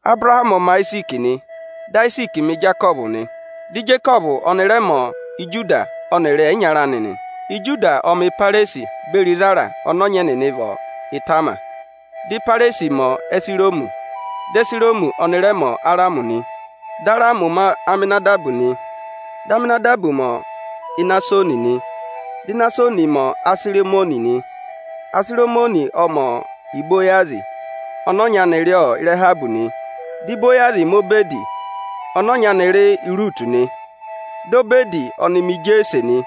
Abụrahamị ọ ma Ayiziiki nị, dị Ayiziiki ma Ijekọvụ nị, dị Ijekọvụ ọnị rẹ ma Ijuda ọnịrị ẹyịnyara anị nị. Ijuda ộ ma Ịpẹrẹzị beri Ịzẹra ọnị ọnyị ẹnịnị vị Ịtama; di Ịpẹrẹzị ma Ihezironi, di Ihezironi ọnị rẹ ma Aramị nị. Dị Aramị ma Aminadabi nị, dị Aminadabi ọ ma Inasoni nị, dị Inasoni ma Ịsarịmọnị nị. Ịsarịmọnị ọ ma Ibowazị ọnị ọnya nị rị Ịrahabị nị, di Ibowazị ma Obẹdị, ọnị ọnya anị rị Iruutu nị, dị Obẹdị ọnị ma Ijeese nị.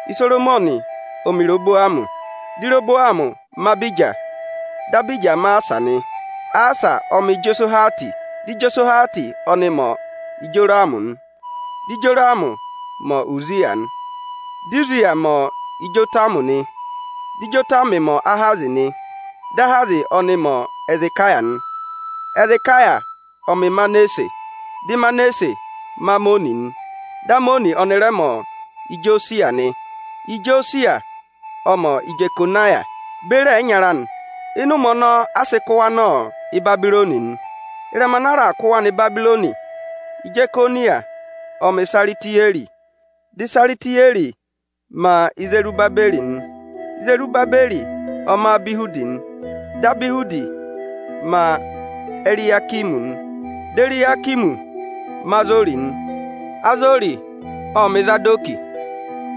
Isoromọnị ọ ma Irehobomi, dị Irehobomi ma Abija, dị Abija ma Asahwi nị. Asahwi ọ ma Ijehosahwati, dị Ijehosahwati ọnị ma Ijorami nị; dị Ijorami ma Uziya, dị Uziya ma Ijotami nị, dị Ijotami ma Ahazi nị, dị Ahazi ọnị ma Ihezekaya nị. Ihezekaya ọ ma Ịmanasẹ, dị Ịmanasẹ ma Amọnị nị, dị Amọnị ọnị rẹ ma Ijosaya nị. Ijosaya ọ ma Ijekoniya beri ẹyịnyara anị nị; ịnị ụmẹ ọnọọ a sị kụ wa nọ Ịbabịrọnị nị. Ịrẹma ana a raà kụ nọ Ịbabịrọnị, Ijekoniya ộ ma Isaritiyẹrị, dị Isaritiyẹrị ma Izerubabẹrị nị. Izerubabẹrị ọ ma Abihudi, dị Abihudi ma Eriyakimi nị, dị Eriyakimi ma Azori nị. Azori ộ ma Ịzadọkị,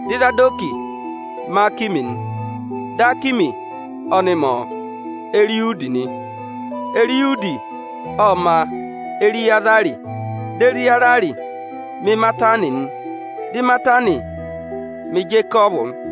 dị Ịzadọkị ma Akimi nị, dị Akimi ọnị ma Eriyudi nị. Eriyudi ộ ma Eriyaza, dị Eriyaza ma Imatani, dị Imatani ma Ijekọvụ nị.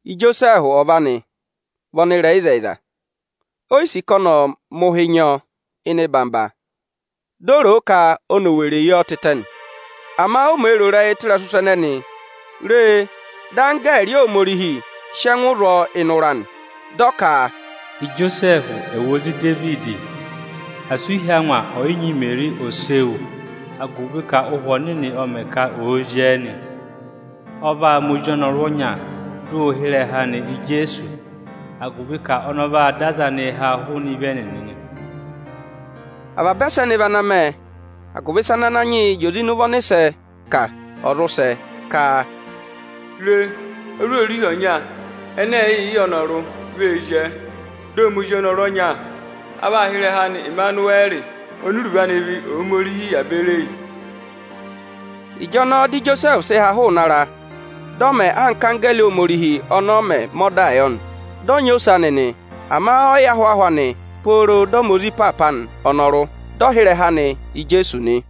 Ijosẹẹhụ ọva anị vị ọnịrẹyịzẹyịza, o yi sì ka ọnị ọ̀ mẹ̀ ụhị nyị ọ eyi ịnọyị-ịnọyị; dị ó rò o ka ọnị ee weree yi ọ tịtẹ nị. Ama o mee rò ịrẹyị tụ ịrẹsụ ịsa ẹnẹnị, re, dị anggẹẹrị Ohomorihi sị ẹngụ zụ ọ ịnị ụra nị. Dị ọ ka, “Ijosẹẹhụ, ozi Idevidi, asị u hí angwa ọyị nyị Imeri ose wu, agụvị ka Ụhwẹ ọnịnị ọ mẹ ka oo zyẹẹ nị. Ọ vaa ma ozi ọnọrụ ọnya, dị ụ hị́ ịrẹha anị Ijeesu; agụvị ka ọnị ọ vaa dọ aza anịị háa hụụnị ịvị ẹnịnị nị.” Avaba ẹsẹnị vị ana mẹ, agụvị ịsị ana Ananyị yị zị oze ịnị ụvọ ọnịsẹ ka, ọ̀ zụ sẹ ka: “Re, ozwoorihi ọnya ẹnẹ ẹ̀ẹẹ̀ yị yẹ ọnọrụ vee zyẹẹ, dị ọ ma ozi ọnọrụ ọnya. A vaa hị́ ịrẹha anị Ẹmanụwẹrị oni iruvo anị vị Ohomorihi yà beri eyi.” Ịjọnọọ dị Ijosẹẹhụ sị ha hụụnị ara, dị ọ mẹ anka anggẹẹrị Ohomorihi ọnọọ mẹ̀ mẹ ọdaa yọ nị, dị ọ nyị ose anị nị. Ama ọ yị yẹ ahwaahụ anị pooro dị ọ ma ozi ịpaapa anị ọnọrụ, dị ọ sị́ ịrẹha yọ ka ọnị ọ rị Ijeesu nị.